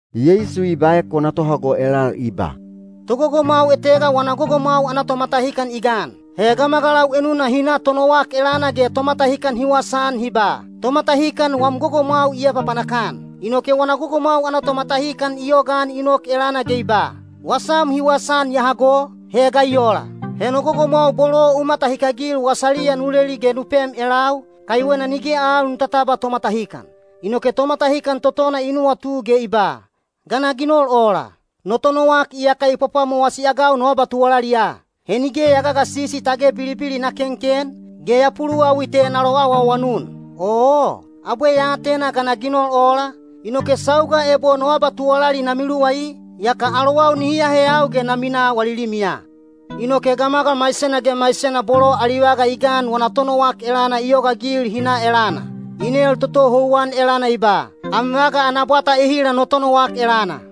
Yeisu i baek wana tohago elal i ba, “Togogomwau etega wana gogomwau ana tomatahikan i gan. He gamagalau enuna hi na tonowak elana ge tomatahikan hi wasaan hi ba, ‘Tomatahikan wam gogomwau i apapanak-an.’ Inoke wana gogomwau ana tomatahikan i yogaan i nok elana ge i ba, ‘Wasam hi wasaan ya hago, he ga i ola? He no gogomwau bolo u matahikagil wasaliya nu leli ge nu pem elau, kaiwena nige al nu tatabwa tomatahikan.’ Inoke tomatahikan totona i nuwatu ge i ba, ‘Ga na ginol ola? No tonowak iyaka i pwapwamowasi-agau no abatuwalaliya. He nige ya gagasisi tage bilibili na kenken, ge ya puluwawi te na loawaawanun. Oo, abwe ya atena ga na ginol ola, inoke sauga ebo no abatuwalali na miluwai, yaka alowau nihi aheyau ge na minaa wali limiya.’ Inoke gamagal maisena ge maisena bolo ali vaga i gan wana tonowak elana i yogaagil hi na elana. I nel toto houwan elana i ba, ‘Am vaga ana bwata ehila no tonowak elana?’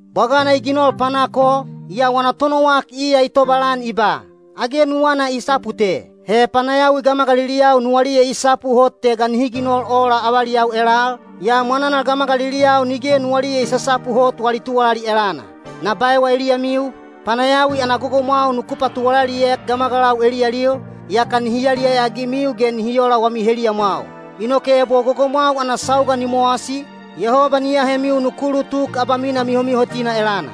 Bwagana i ginol panak o, yaa wana tonowak iya i tobalan i ba, ‘Age nuwana i sapu te.’ He panayawi gamagaliliyau nuwaliya i sapu hot te ga nihi ginol ola avaliyau elal, yaa mwananal gamagaliliyau nige nuwaliya i sasapu hot wali tuwalali elana. Na baewa eliyamiu, panayawi ana gogomwau nuku patuwalaliek gamagalau eliyalil, yaka nihi yaliyaya-agimiu ge nihi ola wami heliyamwau. Inoke ebo gogomwau ana sauga ni mowasi, Yehoba ni ahemiu nuku ulutuk abamina mihomihotina elana.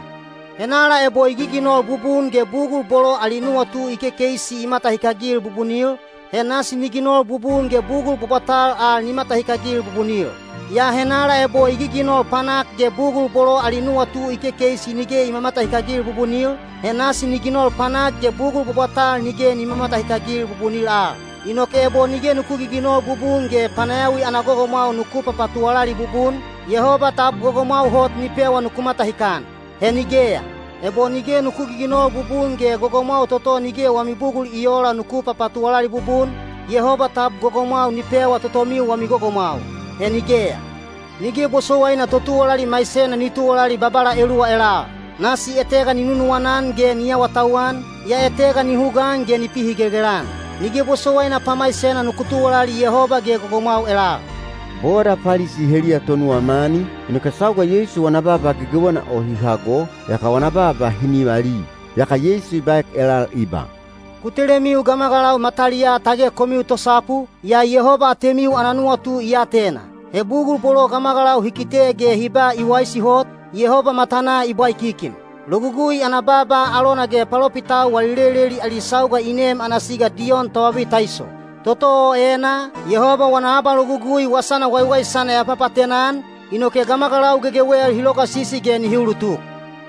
Henala ebo i giginol bubun ge bugul bolo ali nuwatu i kekeisi i mamatahikagil bubunil, he nasi ni ginol bubun ge bugul bwabwatal al ni matahikagil bubunil. Yaa henala ebo i giginol panak ge bugul bolo ali nuwatu i kekeisi nige i mamatahikagil bubunil, he nasi ni ginol panak ge bugul bwabwatal nige ni mamatahikagil bubunil al. Inoke ebo nige nuku giginol bubun ge panayawi ana gogomwau nuku papatuwalali bubun, Yehoba tab gogomwau hot ni pewa nuku matahikan? He nigeya! Ebo nige nuku giginol bubun ge gogomwau toto nige wami bugul i oola nuku papatuwalali bubun, Yehoba tab gogomwau ni pewa totomiu wami gogomwau? He nigeya! Nige bosowaina totuwalali maisena ni tuwalali babala eluwa elal. Nasi etega ni nunuwana-an ge ni awatauwan, yaa etega ni hugaan ge ni pihigelgel-an. Nige bosowaina pamaisena nuku tuwalali Yehoba ge gogomwau elal.” Boda Palisi heliya tonuwa mani, inoke sauga Yeisu wana baaba gegewena o hi hago, yaka wana baaba hi nivali. Yaka Yeisu i baek elal i ba, “Ku telemiu gamagalau mataliyaa tage komiu tosapu, yaa Yehoba atemiu ana nuwatu i atena. He bugul bolo gamagalau hi kite ge hi ba i waisi hot, Yehoba matanaa i bwaikikin. “Logugui ana baaba alona ge palopitau wali leleli ali sauga i nem ana siga Diyon Tobabitaiso. Toto o enaa, Yehoba wana abalogugui wasana waiwaisana ya papaatena-an, inoke gamagalau gegewel hi logasisi ge nihi ulutuk.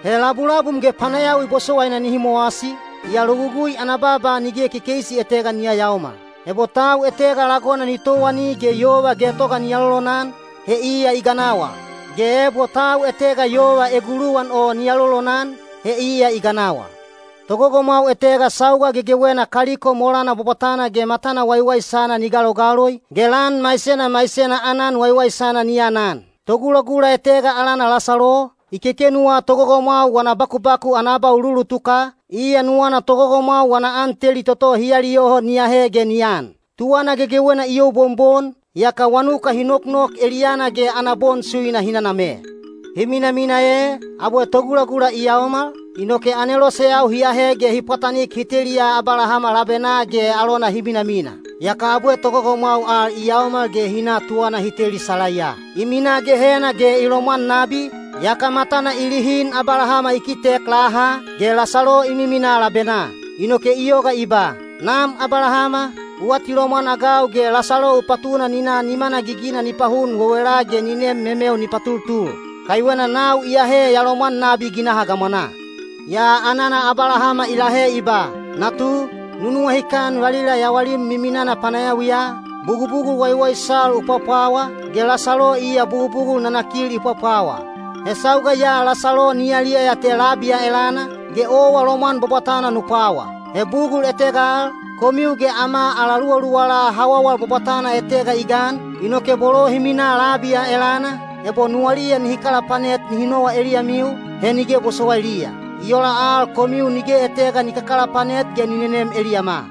He labulabum ge panayawi bosowaina nihi mowasi, yaa Logugui ana baaba nige kekeisi etega ni yayaomal. “Ebo tau etega lagona ni towani ge yova getoga ni alolonan, he iya i ganawal. Ge ebo tau etega yova eguluwan o ni alolonan, he iya i ganawal.” “Togogomwau etega sauga gegewena kaliko molana bwabwatana ge matana waiwaisana ni galogaloi, ge lan maisena maisena aanan waiwaisana ni anan. Togulagula etega alana Lasalo, i kekenuwa togogomwau wana bakubaku ana abauluulutuka, iya nuwana togogomwau wana an teli toto hi aliyoho ni ahe ge ni an. Tuwana gegewena i youbonbon, yaka wanuka hi noknok eliyana ge ana bon suina hi naname. Hi minamina ee, abwe togulagula i yaomal, inoke aneloseyau hi ahe ge hi pwatanik hi teliya Abalahama labenaa ge alona hi minamina. Yaka abwe togogomwau al i yaomal ge hi na tuwana hi teli salaiya. I minaa Gehena ge i lomwan nabi, yaka matana i lihin Abalahama i kitek laha, ge Lasalo i miminaa labenaa. Inoke i yoga i ba, ‘Nam Abalahama, u atilomwan-agau ge Lasalo u patuna ni na nimana gigina ni pahun wewela ge ni nem memeu ni patultul. Kaiwena nau iyahe ya lomwan nabi ginaha gamwanaa.’ Yaa anana Abalahama i lahe i ba, ‘Natu, nu nuwahikan valila yawalim miminana panayawiya, bugubugul waiwaisal u pwapwawa, ge Lasalo iya bugubugul nanakil i pwapwawa. He sauga ya Lasalo ni yaliyaya te labi ya elana, ge owa lomwan bwabwatana nu pwawa. He bugul etega al, komiu ge ama ala luwaluwala hawawal bwabwatana etega i gan, inoke bolo hi minaa labi ya elana, ebo nuwaliya nihi kalapanet nihi nowa eliyamiu, he nige bosowailiya. I ola al komiu nige etega ni kakalapanet ge ni nenem eliyama.’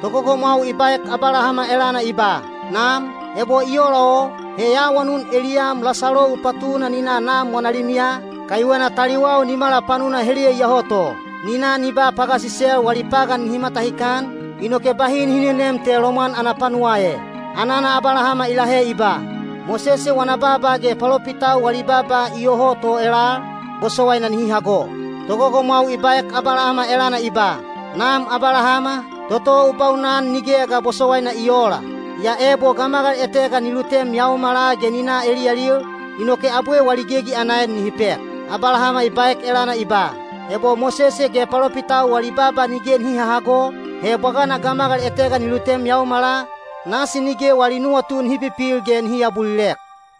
Togogomwau i baek Abalahama elana i ba, ‘Nam, ebo i ola o, he ya awanun eliyam Lasalo u patuna ni na nam wana limiya, kaiwena taliwau nimala panuna heliya iyoho to. Ni na ni ba pagasisel wali pagan nihi matahikan, inoke bahi nihi nenem te lomwan ana panuwaa e.’ Anana Abalahama i lahe i ba, ‘Mosese wana baaba ge palopitau wali baaba iyoho to elal, bosowaina nihi hago.’ Togogomwau i baek Abalahama elana i ba, ‘Nam Abalahama, toto u baunan nigeya ga bosowaina i oola. Yaa ebo gamagal etega ni lutem yaomala ge ni na eliyalil, inoke abwe wali gegi ana en nihi pek.’ Abalahama i baek elana i ba, ‘Ebo Mosese ge palopitau wali baaba nige nihi hahago, he bwagana gamagal etega ni lutem yaomala, nasi nige wali nuwatu nihi pipil ge nihi aabulilek.’”